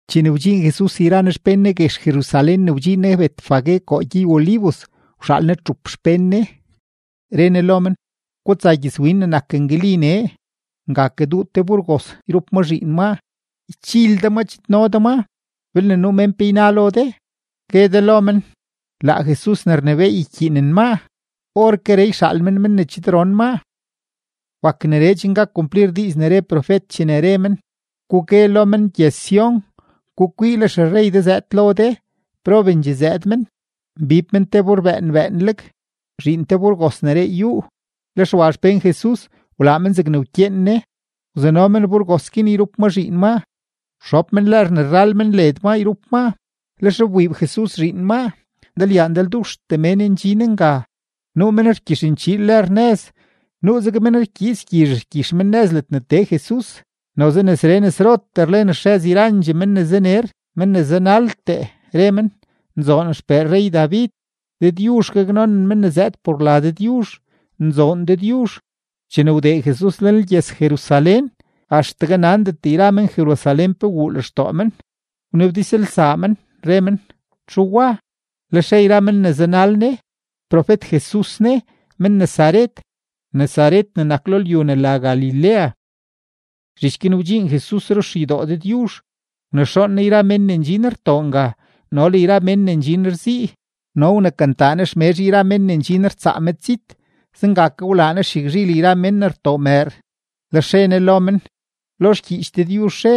Chene wdxiin Jesus yra Ne xpén Ne guex Jerusalén ne wdxiin Ne Betfagé koo gyey-Olivos, wxaal Ne txup xpén Ne, re Ne lo men: ―Gutsa gyëzwin ne nak ngali nee. Nga kaduu te burgos yrup ma zhiin maa. Ychil de ma, chidno de maa. Belne nuu mén pe yna lo de, gue de lo men: “Laa Jesus ne rnebééy ykyiinen maa. Orkeree yxaal men men ne chidron maa.” Wak neree chen gak kumplir diiz ne re profet chene re men: Gugue lo men gyëz-Sión: “Gukwii, le xerrey de zëëd lo de, probendxee zëëd men, mbib men te bur bëën bëënleg, zhiin te burgos ne reey yúú.” Lex wa xpén Jesus, wlaa men zegne wkyeen Ne. Wzano men burgos guin yrup ma zhiin maa, wxob men lër ne rrël men led maa yrup maa, lex wbiib Jesus zhiin maa. Ndalyaa ndalduxtee mén ndxin nga, nuu men rgyixnchiil lër nëz, nuuzeg men rkyiits gyizh rgyix men nëz ledne tee Jesus. Noze nesree nesrotee rlen xrëz yrandxee mén ne zaner men ne zanaltee, re men: ―¡Nzoon XPee rrey-David! ¡Dëdyuzh gaknonen men ne zëëd por la Dëdyuzh! ¡Nzoon Dëdyuzh! Chene wdee Jesus lenlgyëz-Jerusalén, axtegue nandet yra men-Jerusalén pe wuu lextoo men, wnabdizlsaa men, re men: ―¿Txu wa? Lex re yra men ne zanal Ne: ―Profet-Jesus ne, men-Nazaret, Nazaret ne nak lo lyu ne la Galilea. Zhich guin wdxiin Jesus ruxeydoo Dëdyuzh, wnexoon Ne yra mén ne ndxin rtoo nga no le yra mén ne ndxin rzii, no wnekantaa Ne xmezh yra mén ne ndxin rtsaa medzit; zenga ke wlaa Ne xyagzhil yra mén ne rtoo mëër. Lex re Ne lo men: ―Lo xgyiich Dëdyuzh re: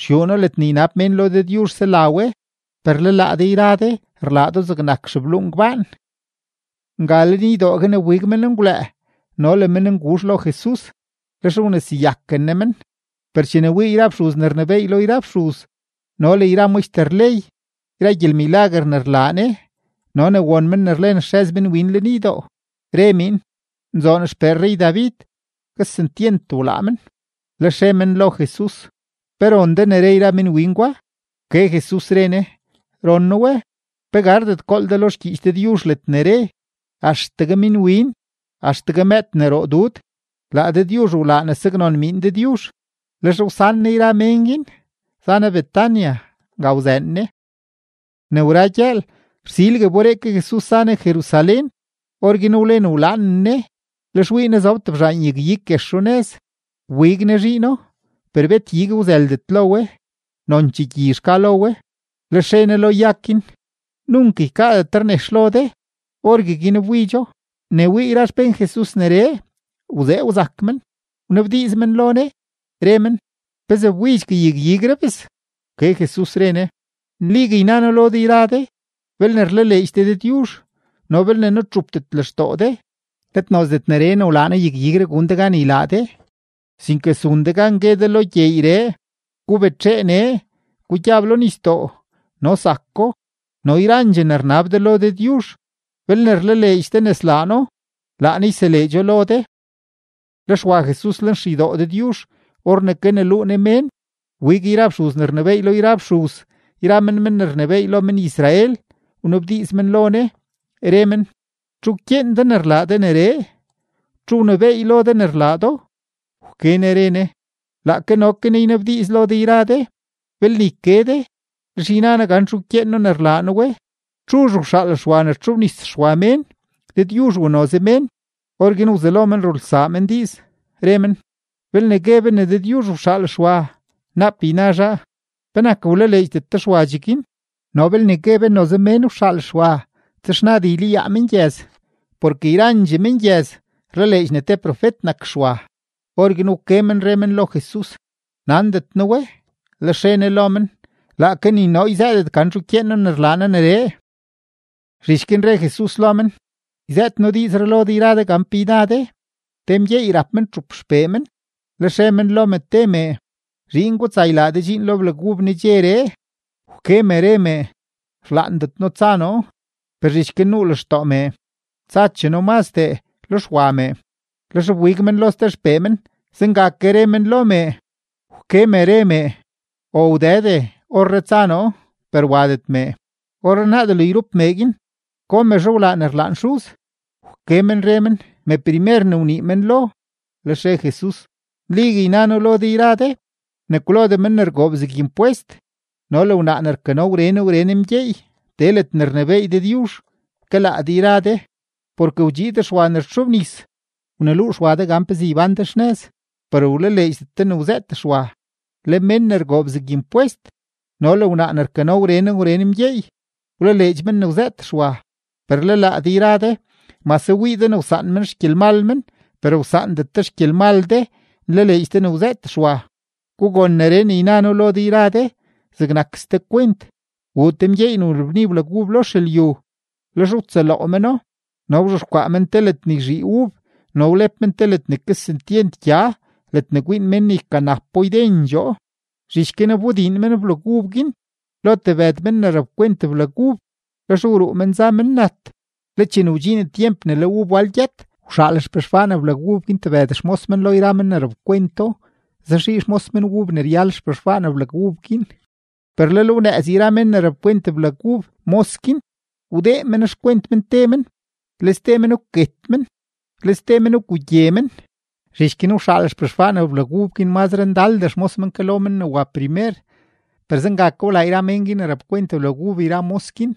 “Xyuu noo, ledne ynab mén lo noo sela we”; per le laa de yra de rlaa do zegnak xebluu ngbaan. Nga lenydoo guin wbig menngwlëë no le mennguzh lo Jesus, lex wneseyaken Ne men. Per chene wii yra fxuz ne rnebééy lo yra fxuz no le yra maxter ley yra gyelmilaguer ne rlaa Ne no ne won men ne rlen xrëz minwin lenydoo, re miin: “¡Nzoon XPee rrey-David!”, kesentyent wlaa men. Lex re men lo Jesus: ―¿Pe ron de ne re yra minwin gwa? Wke Jesus, re Ne: ―Ron noo we. ¿Pe gardet gool de lo xgyiich Dëdyuzh ledne re: Axtegue minwin, axtegue mëëd ne roo dud, laa Dëdyuzh wlaa ne saknon miin Dëdyuzh? Lex wsan Ne yra mén guin, za Ne Betania, nga wzëën Ne. Ne wra gyëël, rsilgue wberee ke Jesus za Ne Jerusalén, orguin wlen wlaanen Ne. Lex wii Ne zob tebzhaan yag-ig guex runëz, wbig Ne zhiino, per bet ig wzëldet lo we, nonchee gyizh ka lo we. Lex re Ne lo yag guin: ―¡Nunk ykaadetre nex lo de! Orgueguin wbidxo. Ne wii yra xpén Jesus neree, wzee wzak men; wnabdiiz men lo Ne, re men: ―¿Pezee wbidxgue yag-igree, bes? Wke Jesus, re Ne: ―Nligue yna noo lo de yra de, belne rlaleedx de Dëdyuzh no belne nutxupdet lextoo de, let nozdet neree ne wlaa noo yag-igree gun de gan ylaa de, sinke zun de gan gue de lo gyeeyree: “Gubetxee nee, gugyab lo nisdoo”, no zako. No yrandxee ne rnab de lo Dëdyuzh, belne rlaleedx de ne slaa No, laa Ne yseleedxo lo de. Lex wa Jesus lenxeydoo Dëdyuzh; or ne kaneluu Ne mén, wbig yra fxuz ne rnebééy lo yra fxuz yra men men ne rnebééy lo men-Israel, wnabdiiz men lo Ne, re men: ―¿Txu wkyeen de ne rlaa de neree? ¿Txu wnebééy lo de ne rlaa do? Wke Ne re Ne: ―Laake no ke noo ynabdiiz lo de yra de; belne yke de, lex yna noo gan txu wkyeen noo ne rlaa noo we. ¿Txuzh wxaal Xwa ne wtxobnis Xwa mén, Dëdyuzh u noze mén? Orguin wzelo men rulsaa men diiz, re men: ―Belne gue be ne Dëdyuzh wxaal Xwa, naap yna zhaa: “¿Penak wlaleedxdet de Xwa cheguin?” No belne gue be noze mén wxaal Xwa, texnad ylayaa mengyëz, porke yrandxee mengyëz rlaleedx ne te profet nak Xwa. Orguin wke men re men lo Jesus: ―Nandet noo we. Lex re Ne lo men: ―Laake ni noo yzëëdet gan txuzh wkyeen noo ne rlaa noo neree. Zhich guin re Jesus lo men: ―Yzëët noo diizree lo de yra de gan pe yna de. Te mgyeey rap men txup xpee men, lex re men lo me te mee: “Zhiin, gutsa ylaa de dxiin lo blag ub nedxeree.” Wke me, re mee: “¡Rlaandet noo tsa noo!” Per zhich guin nuu lextoo mee: “Tsachee noo mazdee.” Lex wa mee. Lex wbig men lo ste xpee men, zenga ke re men lo mee. Wke me, re mee: “Ow Dëde, orree tsa noo.” Per wadet mee. Orrenaa delo yrup mee guin, ¿go mezhe wlaa ne rlaan xuz? Wke men re men: ―Meprimer ne wnii men lo. Lex re Jesus: ―Nligue yna noo lo de yra de ne kwlodee men ne rgoob zeg impwest no le wnaa ne rkano wren wren mgyeey tee ledne rnebééy Dëdyuzh ke laa de yra de. Porke wdxiid Xwa ne rtxobnis wneluu Xwa de gan pezee ybán de xnëz, per wlaleedxdet de ne wzëët Xwa; le men ne rgoob zeg impwest no le wnaa ne rkano wren wren mgyeey, wlaleedx men ne wzëët Xwa. Per le laa de yra de mase wii de ne wsaan men xgyelmal men, per wsaandet de xgyelmal de nlaleedx de ne wzëët Xwa. ’Gugon neree ne yna noo lo de yra de zegnak ste kwent: Wuu te mgyeey ne wlabni blag ub lo xelyu, lex wtsëloo meno, no wzhexkwaa men te ledne yzhii ub, no wlep men te ne kesentyent gya ledne kwiin men ne ykanapo ydendxoo. ’Zhich guin wbodiin men blag ub guin lo tebëd mén ne rapkwent blag ub. Lex wruu men za men nat. Le chene wdxiin tyemp ne le ub wal gyët, wxaal xpexwaan blag ub guin tebëd xmos men lo yra men ne rapkwento, zaxii xmos men ub ne ryal xpexwaan blag ub guin. Per lel wnëëz yra men ne rapkwent blag ub mos guin, wdee men xkwent men te men, le ste men wket men, le ste men wgugye men. Zhich guin wxaal xpexwaan blag ub guin mazre ndaldee xmos men ke lo men ne wa primer, per zenga ke wlaa yra mén guin ne rapkwent blag ub yra mos guin.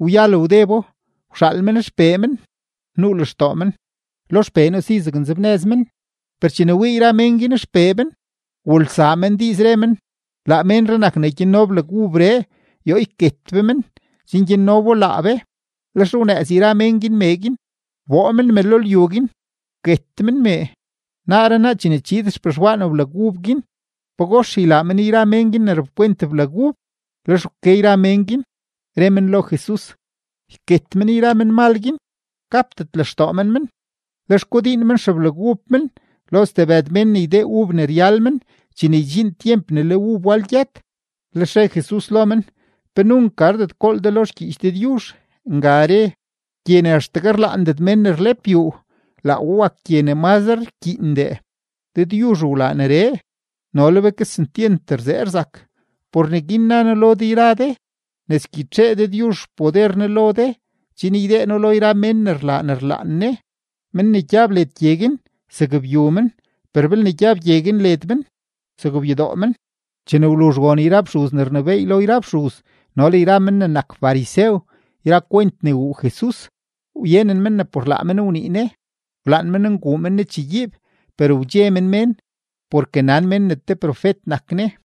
’Wyal wdebo, wxaal men xpee men, nuu lextoo men: “Lo xpee noo si zaknzebnëz men.” Per chene wii yra mén guin xpee men, wulsaa men diiz, re men: “Laa ménree nak ne gyanno blag ubree; yoo yket be men, chen gyanno bo laa be.” Lex wnëëz yra mén guin mee guin, wboo men me lo lyu guin, wket men mee. ’Naaree naa chene chiid xpexwaan blag ub guin, ¿pagox ylaa men yra mén guin ne rapkwent blag ub? Lex wke yra mén guin, re men lo Jesus: ―Yket men yra menmal guin, gapdet lextoo men men. Lex kodiin men xeblag ub men lo stebëd mén ne ydee ub ne ryal men chene ydxiin tyemp ne le ub wal gyët. Lex re Jesus lo men: ―¿Pe nunk gardet gool de lo xgyiich Dëdyuzh? Nga re: Gye ne axtegue rlaandet mén ne rlep yuu, laa we wak gye ne mazre rkyiindee. Dëdyuzh wlaa neree, no le be kesentyent rzee rzak. Por neguin na noo lo de yra de ne sgyitxee Dëdyuzh xpoder Ne lo de chen ydee No lo yra mén ne rlaa ne rlaan Ne. Men ne gyab led gye guin, zakbyu men, per belne gyab gye guin led men, zakbyudoo men. Chene wluzh won yra fxuz ne rnebééy lo yra fxuz no le yra men ne nak farisew yra kwent ne wuu Jesus, wyenen men ne por laa men wnii Ne. Wlaan men nguu men Ne chegyiib, per wdxe men mén porke nan mén ne te profet nak Ne.